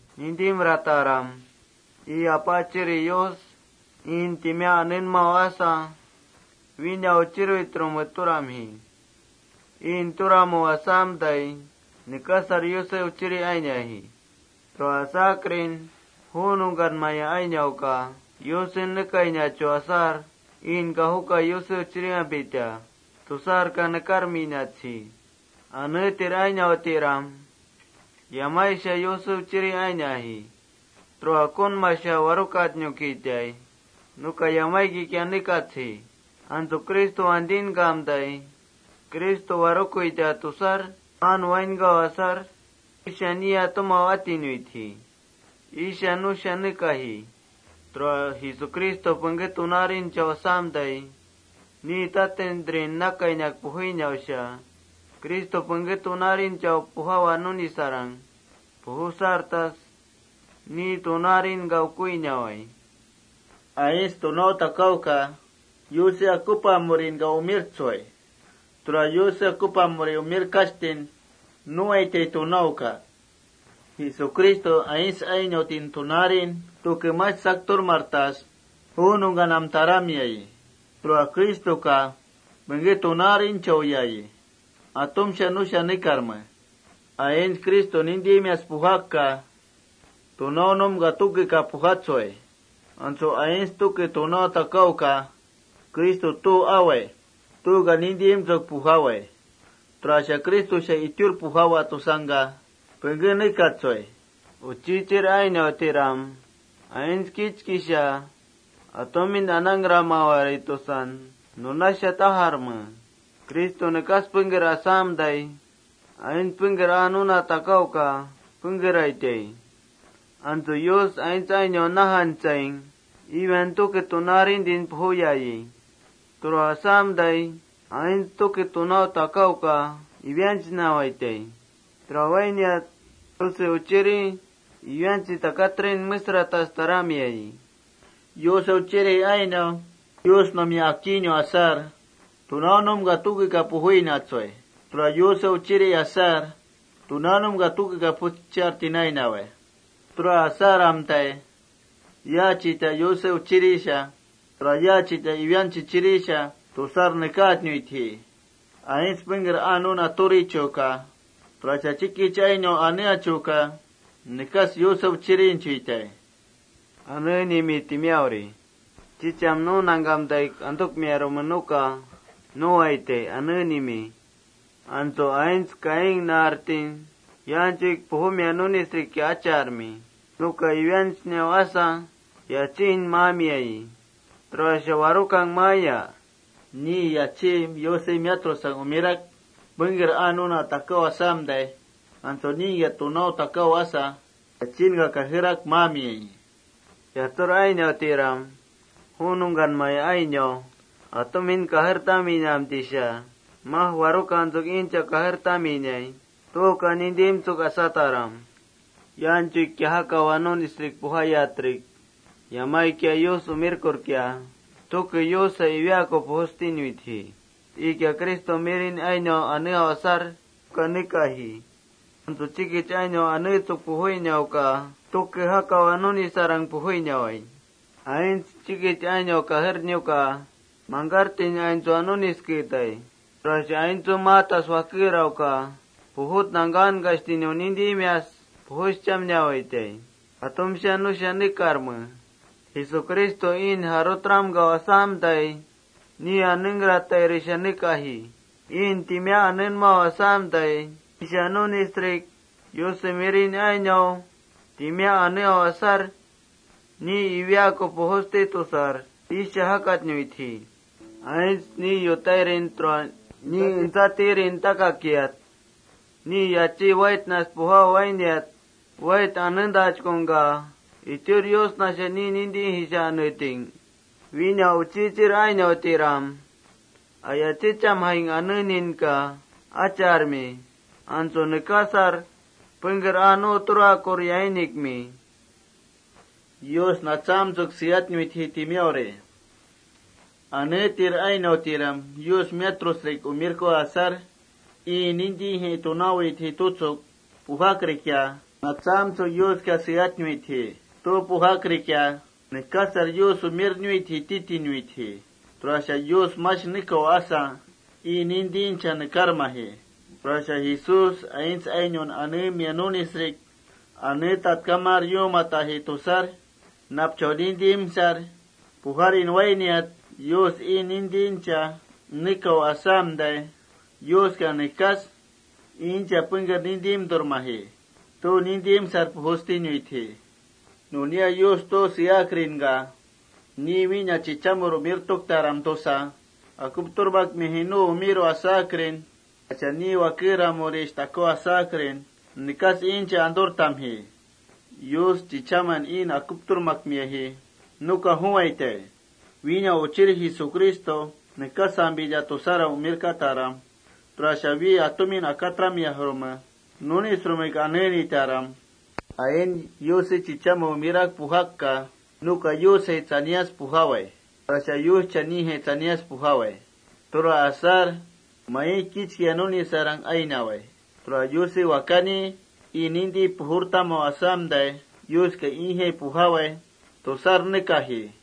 Nintimrataram. Ii Apaachiri Yus iin timiá anenmau asa: Wína uchiruitrume turamji. Iin turamu asamtai, nekasar Yuse uchiri ainiaji. Tura asakrin ju nungkanmaya ainauka Yusen nekainachu asar iinka: Juka Yuse uchiriyampita tusarka nekarminatsji.+ Aneetir ainautiram, yamaisha Yuse uchiri ainiaji. Tura ukunmasha warukatnukitaij nuka yamaikikia nekatsji. Antsu Cristo wantinkamtai, warukuita tusar paan wainkau asar, iisha Niya tumau atinuitji. Iisha nusha nekaji.+ Tura Jesucristo pengké tunaarinchau asamtai, ni tatintrin nakainak pujuinausha Cristo pengké tunaarinchau pujawa nunisarang pujusartas ni tunaarinka ukuinawai. Aints tunau takauka Yuse akupamurinka umirtsui. Tura Yuse akupamurin umirchauka tunaun turawai. Jesucristo aints ainauti tunaarin tuke mash sakturmartas ju nungkanam taramiayi. Tura Cristoka pengké tunaarinchauyayi. Atumsha nusha nekarme.+ Aints Criston nintimias pujakka, tunaunumka tukeka pujatsui. Antsu aints tuke tunau takauka: Cristo tu awai tuuka nintimtsuk pujawai, tura Cristosha itiur pujawa tusangka pengké nekatsui. Uchichir ainautiram, aints kichkisha atumin anangkramawarai tusan nunasha tajarme: Cristo nekas pengker asamtai, aints pengker aa nuna takauka pengkeraitai. Antsu Yus aints ainaun najantsaing, Satanás tuke tunaarintin pujuyayi. Tura asamtai aints tuke tunau takauka Satanásnawaitai. Tura wainiat Yuse Uchiri Satanása takatrin mengkaaktas taramiayi.+ Yuse uchiri ainau Yusnumia akiinau asar, tunaanumka tukeka pujuinatsui. Tura Yuse uchiri asar, tunaanumka tukeka pujuschartin ainawai. Tura asamtai ¿yaachita Yuse uchirisha, tura yaachita Satanása uchirisha? tusar nekaatnuitji. Pengker aa nuna turichuka, tura chikich ainaun aneechuka nekas Yuse uchirinchuitai tusar nekaatnuitji. Chicham nu nangkamtaik antukmiarume nuka nuwaitai: Aneenimi.+ Antsu aints Caín naartin yaanchuik pujumia nunisrikia acharmi. Nuka Satanásnau asa yachiin maamiayi. ¿Tura warukang maaya? Ni yachí Yusen miatrusang umirak pengker aa nuna takau asamtai, antsu ningkia tunau takau asa, yachiinka kajerak maamiayi.+ Yatsur ainautiram, ju nungkanmaya ainau atumin kajertaminamtaisha: Maj ¿warukantsuk iincha kajertaminai? tuuka nintimtsuk asataram. Yaanchuikia jakawa nunisrik pujayatrik, yamaikia Yus umirkurkia, tuke Yusjai iwiaaku pujustinuitji. Iikia Cristonu ainau aneau asar nuka nekaji. Antsu chikich ainau aneetsuk pujuinauka tuke jakawa nunisarang pujuinawai. Aints chikich ainaun kajernuka mangkartin aintsua nunisketai. Tura aintsun maatas wakerauka pujut nangkankashtinaka nintimias pujuschamnawaitai. Atumka nusha nekarme. Jesucristo iin jarutramkau asamtai, ni anengkratairisha nekaji. Iin timiá anenmau asamtai, iisha nunisrik Yusnau ainau aneau asar, ni iwiaaku pujusti tusar iisha jakatnuitji.+ Aints ni yutairin tura ni entsatirin takakiat, ni yachí waitnas pujau wainiat, wait anentachkungka ¿itiur Yusnasha ni nintijaisha aneeting? Wina uchichir ainautiram, aya chichasrikia: Aneajme tutsuk asarmi. Antsu nekasar pengker aa nu turakur yainikmi tajarme. Aneetir ainautiram, ii nintijai: Tunaawitjai tutsuk pujakrikia, natsaamtsuk Yuska seatnuitji. Tu pujakrikia, Yuse chichame nekas aa nu umirnuitji titinuitji. Tura asakrin Yus mash nekau asa, ii nintincha nekarmaji. Tura Jesús aints ainaun aneemia nunisrik aneetatkamar yuumataji tusar, napchau nintimsar pujarin wainiat, Yus ii nintincha nekau asa nekas iincha paan nintimtikramji, tu nintimsar pujustinuitji.+ Yus tu seakrinkia Yus: Wína chichamur umirtuktaram tusa akupturmakmiaji nu umiru asar, tura ni wakeramurisha umiru asakrin ii seaji nunaka mash suramsatnuitji.+ Yus ni chichamen: Umirtuktaram tusa, akupturmakmiaji nuka juwaitai: Wína Uchir Jesucristo nekasampita titaram, tura wi chichaman akuptukmiajrume nunisrumek aneenitaram.+ Aints Yuse chichamen umirak pujakka, nuka Yusjai tsanias pujawai, tura Yuscha nijai tsanias pujawai. Tura asar mai kichkia nunisarang ainawai. Tura Yuse Wakani ii nintin pujurtamu asamtai, Yuska iijai pujawai tusar nekaji.+